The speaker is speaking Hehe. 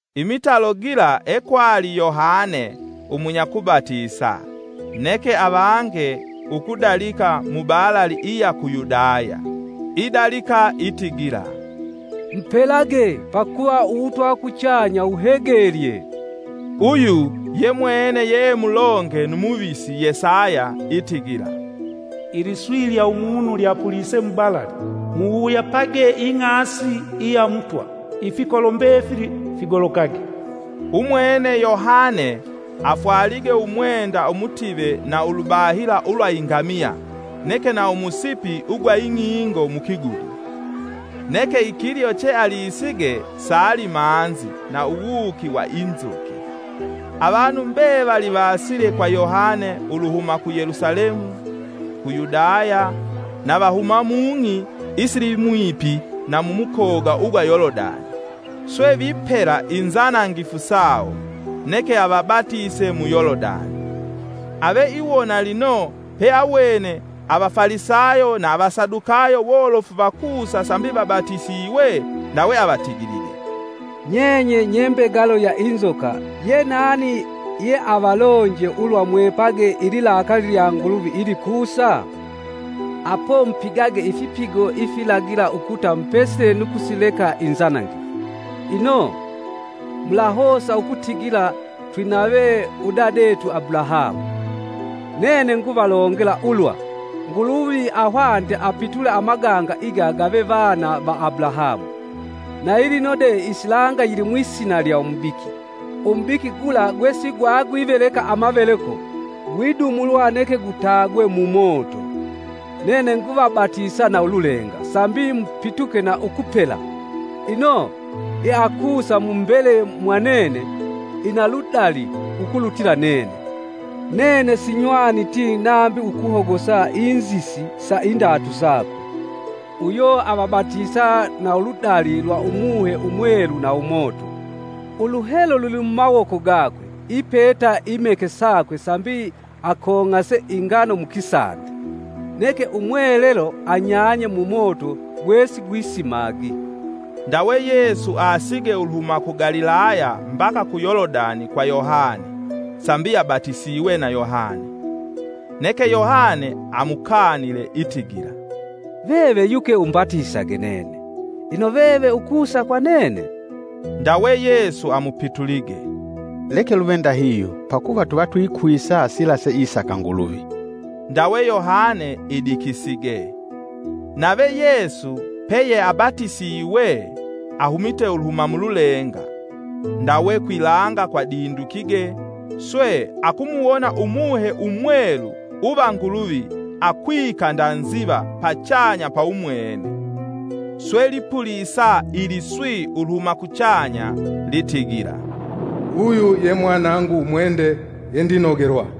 Imitalo gila ekwali Yohane umunyakubatisa, neke avange ukudalika mubalali iya ku Yudaya, idalika itigila, “Mupelage, pakuva uwutwa uwa kuchanya wuhegelye.” Uyu yemwene yeemulonge nu muvisi Yesaya itigila, “Iliswi lya umunu lyapulise mubalali: Muwuyapage ing'asi iya Mutwa ifikolo mbefili figolokage.” Umwene Yohane afwalige umwenda umutive na ulubahila ulwa ingamiya, neke na umusipi ugwa ing'ingo Mukigudi. Neke ikilyo che alisige saali manzi na uwuuki wa inzuki. Avanu mbevali vaasile kwa Yohane uluhuma ku Yelusalemu, ku Yudaya na vahuma mung'i isilimwipi na mumukoga ugwa Yolodani, swe vipela inzanangifu sawo, neke avabatise mu Yolodani. Ave iwona lino peawene Avafalisayo na Avasadukayo wolofu vakusa sambi vabatisiwe, ndawe avatigilige, “Nyenye nye mbegalo va inzoka! Ye nani ye avalonje ulwa mwepage ililakaali lya Nguluvi ilikusa? Apo mupigage ifipigo ifilagila ukuta mupesile nu kusileka inzanangifu. Ino mulahosa ukutigila, ‘Twinave Udadetu Abulahamu!’” Nene nguvalongela ulwa, Nguluvi ahwanite apitule amaganga iga gave vana va Abulahamu. Nayilino de isilanga yilimwisina lya umubiki; umubiki gula gwesigwagwiveleka amaveleko, gwidumulwa neke gutagwe mumoto. Nene nguvabatisa na ululenga sambi mupituke na ukupela. Ino yeakusa mu mbele mwa nene ina ludali ukulutila nene, nene sinywaniti nambi ukuhogosa inzisi sa indatu sakwe. Uyo avabatisa na uludali lwa umuhe umwelu na umoto. Uluhelo lulimumawoko gakwe ipeta imeke sakwe sambi akong'ase ingano mukisande, neke umwelelo anyanya mumoto gwesigwisimagi. Ndawe Yesu aasige uluhuma ku Galilaya mbaka ku Yolodani kwa Yohane, sambi abatisiwe na Yohane. Neke Yohane amukanile, itigila, “veve yuke umbatisage nene, ino veve ukusa kwa nene?” Ndawe Yesu amupitulige, “Leke luve ndahihyo pakuva tuva twikwisa sila seisaka Nguluvi.” Ndawe Yohane idikisige. Nave Yesu peyeabatisiwe, ahumite uluhuma mululenga. Ndawe kwilanga kwadindukige, swe akumuwona umuhe umwelu uva Nguluvi akwika nda nziva pachanya pa umwene. Swe lipulisa iliswi uluhuma kuchanya litigila, “Uyu ye Mwanangu umwende, ye ndinogelwa.”